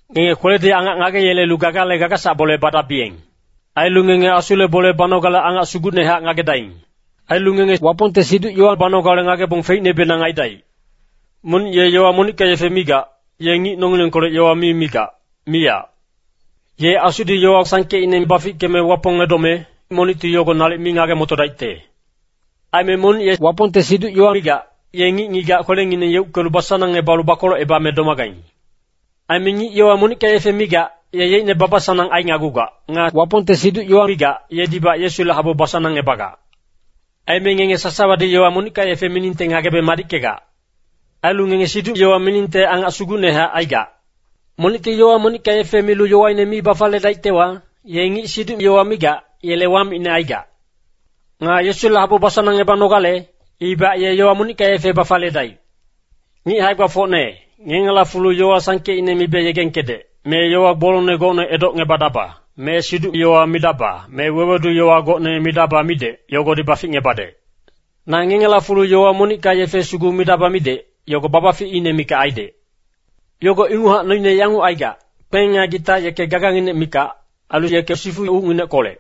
Ngenge kweledi angac ngageyelelu gagale gagasac bole badabiyeng. Ailu ngenge Asule bole banogale angac sugucnehac ngagedaing. Ailu ngenge Wapongte siduc-yowa banogale ngagebong feicnebenang aidaic. Monic ye yowa monicka yefe migac, ye ngic nongilengkolec yowa mi migac, miyac. Ye Asudi yowa sangkeicne bafickeme Wapong edome, monicti yogo nalic mi ngage-motodaicte. Aime monic ye Wapongte siduc-yowa migac, ye ngic-ngigac kwelengineng yeuckelu basanangebalu bakolocebame domagaing. Aime ngic yowa monicka yefe migac, ye yeicne baba-sanang ainagugac. Nga Wapongte siduc-yowa migac, yedibac Yesule habu basanangebagac. Aime ngenge sasawadi yowa monicka yefe miningte ngagebe madickegac. Ailu ngenge siduc-yowa miningte angacne sugucnehac aigac. Monicti yowa monicka yefe milu yowaine mi bafaliyedaictewa, ye ngic siduc-yowa migac, yele wamicne aigac. Nga Yesule habu basanangebanogale, ibac ye yowa monicka yefe bafaliyedaic. Ngic hae-gbafocne, ngengela fulu yowa sangkeicne mibe yegengkedec, me yowa gbolongne gocne edocngebadaba, me siduc-yowa midaba, me wewedu-yowa gocne midaba midec, yogodi baficngebadec. Na ngengela fulu yowa monicka yefe sugu midaba midec, yogo babaficine mikac aidec. Yogo inguchac noine yanguc aigac, kpeng nga gita yeke gaganginec mikac, ailu yeke sifu ucngineckolec.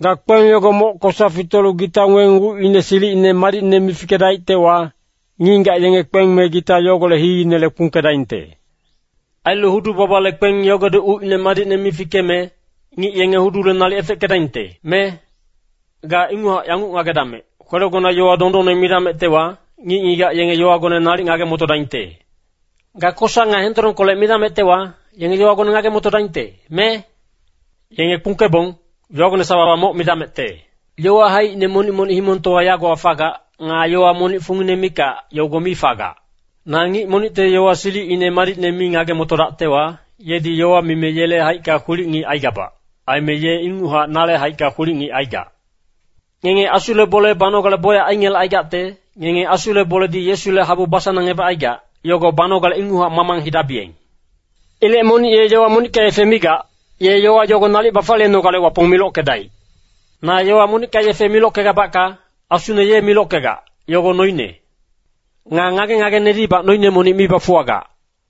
Ga kpeng yogo moc kosa fitolu gita weng ucine silicine madicne mi fikedaictewa, ngic-ngigac yenge kpeng me gita yogolec hiinele kpungkedaingte. Ailu hudu-babale kpeng yogodi ucine madicne mi fikeme, ngic yenge hudule nalic efeckedaingte, me? Ga inguchac yanguc ngagedamec, kwelegona yowa dondonne midamectewa, ngic-ngigac yenge yowagone nalic ngage-motodaingte. Ga kosa nga hendolongkolec midamectewa, yenge yowagone ngage-motodaingte, me? Yenge kpungkebong, yowagone sawawa moc midamecte. Yowa haicine monic-monic himongtowa yagowa fagac. Nga yowa monic fungine mikac, yogo mi fagac. Na ngic monicte yowa silicine madicne mi ngage-motodactewa, yedi yowa mime yele haicka kwilic-ngic aigabac. Aime ye inguchac nale haicka kwilic-ngic aigac. Ngenge Asule bole banogale bocyac aingelecaigacte, ngenge Asule boledi Yesule habu basanangebacaigac, yogo banogale inguchac mamang hidabiyeng. Ilec monic ye yowa monicka yefe migac, ye yowa yogo nalic bafaliyenogale Wapong milockedaic. Na yowa monicka yefe milockegabacka, asune ye milockegac, yogo noine. Nga ngage-ngagenedibac noine monic mi bafuwagac.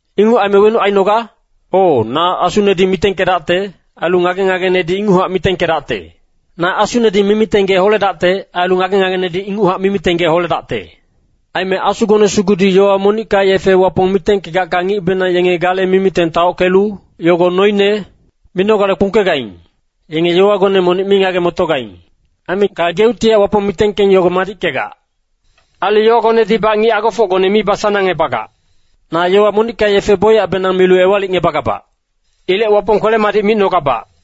Inguc aime wenuc ainoga? O, na asunedi mitengkedacte, ailu ngage-ngagenedi inguchac mitengkedacte. Na asunedi mimiteng gee holedacte, ailu ngage-ngagenedi inguchac mimiteng gee holedacte. Aime asugone sugudi yowa monicka yefe Wapong mitengkegacka ngicbenang yenge gale mimiteng taockelu, “yogo noine” minogale kpungkegaing. Yenge yowagone monic mi ngage-motogaing. Aime gageuctihac Wapong mitengkeng yogo madickegac. Ailu yowagonedibac ngic agofocgone mi basanangebagac. Na yowa monicka yefe bocyacbenang milu ewalicngebagabac. Ilec Wapong kwele-madic micnogabac.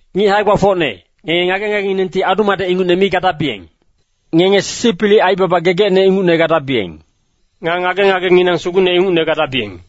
Ngic hae-gbafocne, ngenge ngage-ngagenginengti adu-madec ingucne mi gadabiyeng. Ngenge sisipilic aibaba gegecne ingucne gadabiyeng. Nga ngage-ngagenginang sugucne ingucne gadabiyeng.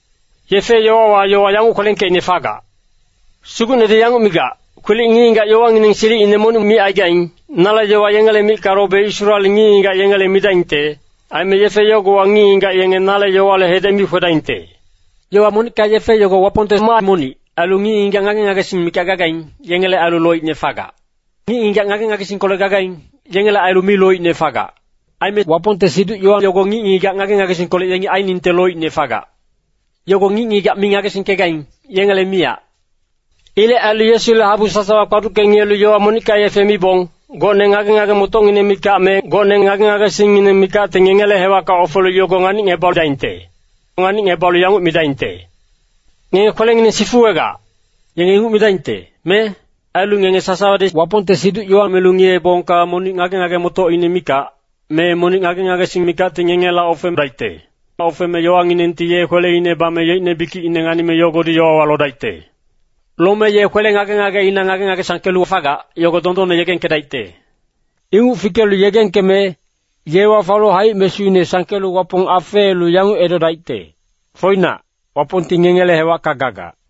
Yefe-yowawa yowa yanguc kwelengkeicne fagac, “Sugucnedi yanguc migac, Kwilic ngic-ngigac yowangineng silicine monic micaigaing, nale yowa yengele micka lobe Israel ngic-ngigac yengela midaingte. Aime yefe yogowa ngic-ngigac yenge nale yowale hedec mi kwedaingte.” Yowa monicka yefe yogo Wapongte maa monic, ailu ngic-ngigac ngage-ngagesing mikac gagaing, yengele ailu loicne fagac. Ngic-ngigac ngage-ngagesingkolec gagaing, yengele ailu mi loicne fagac. Aime Wapongte siduc-yowa yogo ngic-ngigac ngage-ngagesingkolec yengi ainingte loicne fagac. Yogo ngic-ngigac mi ngagesingkegaing, yengele miyac. Ilec ailu Yesule habu sasawa kpaducke ngiyelu yowa monicka yefe mibong, gocne ngage-ngage-motocngineng mikac me gocne ngage-ngagesingngineng mikacti ngengele hewacka ofelu yogo nganicngebadaingte. Nganicngebalu yanguc midaingte, “Ngenge kwelengineng sifuwegac.” Yenge inguc midaingte, me? Ailu ngenge sasawadi Wapongte siduc-yowa milu ngiyeebongka monic ngage-ngage-motocine mikac, me monic ngage-ngagesing mikacti ngengela ofedaicte. Ofeme yowanginengti ye kweleina bame yeicne bikicine nganime yogodi yowawa lodaicte. Lome ye kwele ngage-ngageina ngage-ngage sangkelu fagac, yogo dondonne yegengkedaicte. Inguc fikelu yegengkeme, ye wafalu haic-mesuine sangkelu Wapong afeelu yanguc edodaicte, “Foinac, Wapongti ngengele hewacka gagac!”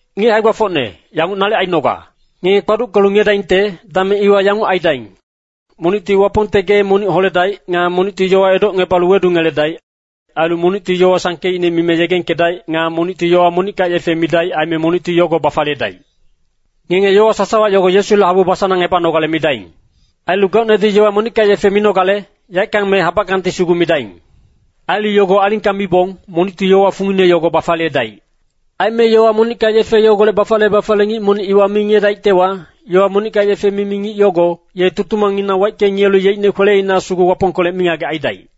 Ngic hae-gbafocne, yanguc nalic ainoga. Ngenge kpaduckelu ngiyedaingte, dameng iwa yanguc aidaing. Monicti Wapongte gee monic holedaic. Nga monicti yowa edocngebalu wedungeledaic. Ailu monicti yowa sangkeicne mime yegengkedaic. Nga monicti yowa monicka yefe midaic, aime monicti yogo bafaliyedaic. Ngenge yowa sasawa yogo Yesule habu basanangebanogale midaing. Ailu gocnedi yowa monicka yefe minogale, yaeckang me habackangti sugu midaing. Ailu yogo alingka mibong, monicti yowa fungine yogo bafaliyedaic. Aime yowa monicka yefe yogolec bafaliye-bafaliye ngic monic iwa mi ngiyedaictewa, yowa monicka yefe mimi ngic yogo, ye tutumangnginang waicke ngiyelu yeicne kweleina sugu Wapongkolec mingagec aidaic.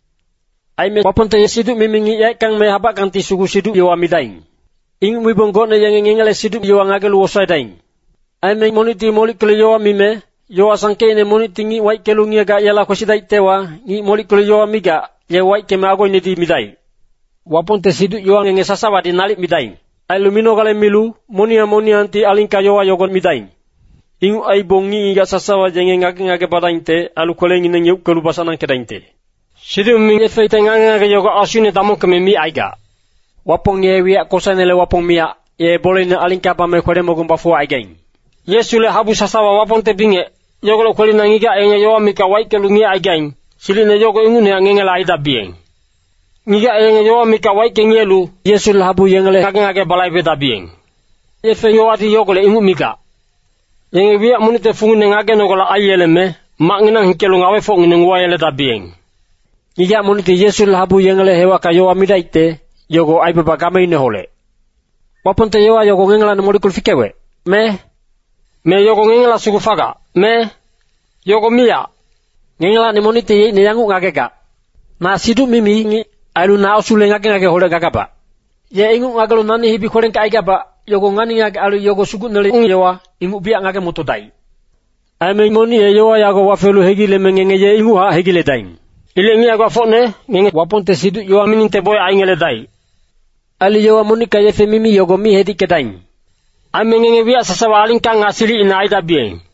Aime Wapongte siduc-mimi ngic yaeckang me habackangti sugu siduc-yowa midaing. Inguc mibong gocne yenge ngengele siduc-yowa ngagelu wosaedaing. Aime monicti molickelu yowa mime, yowa sangkeicne monicti ngic waickelu ngiyegac yela kwesidaictewa, ngic molickelu yowa migac, ye waickeme agoinedi midaic. Wapongte siduc-yowa ngenge sasawadi nalic midaing. Ailu minogale milu, moniyang moniyangti alingka yowa yogo midaing. Inguc aibong ngic-ngigac sasawa yenge ngage-ngage badaingte. Ailu kwelengineng yeuckelu basanangkedaingte. Siduc-mimi ngicte ngage-ngage yogo asuine damongkeme micaigac. Wapong ye wiyac kosainele Wapong miyac, ye boleine alingka bame kwele-mogung bafuwacaigaing. Yesule habu sasawa Wapongte bingec, yogolec kwelina ngigac yenge yowa mikac waickelu ngiyecaigaing, silicine yogo ingucnehac ngengela aidabiyeng. Ngigac yenge yowa mikac waicke ngiyelu, Yesule habu yengele ngage-ngage balaibedabiyeng. Yefe-yowadi yogolec inguc migac. Yenge wiyac monicte fungine ngagenogale aiyeleme, macnginang hikelu ngawefocngineng uwayeledabiyeng. Ngigac monicti Yesule habu yengele hewacka yowa midaicte, yogo aibaba gameineholec. Wapongte yowa yogo ngengelacni molickelu fikewec, me? Me yogo ngengela sugu fagac, me? Yogo miyac! Ngengelacni monicti yeicne yanguc ngagegac, “Na siduc-mimi ngic, ailu na Asule ngage-ngageholec gagabac.” Ye inguc ngagelu nani hibi kwelengkecaigabac, yogo ngani-ngagec ailu yogo Sugucnele ung-yowa, inguc biyac ngage-motodaic. Aime monic ye yowa yago wafelu hegileme ngenge ye inguchac hegiledaing. Ilec ngic hae-gbafocne, ngenge Wapongte siduc-yowa miningte bocyac aingeledaic. Ailu yowa monicka yefe mimi yogo mi hedickedaing. Aime ngenge wiyac sasawa alingka nga silicina aidabiyeng.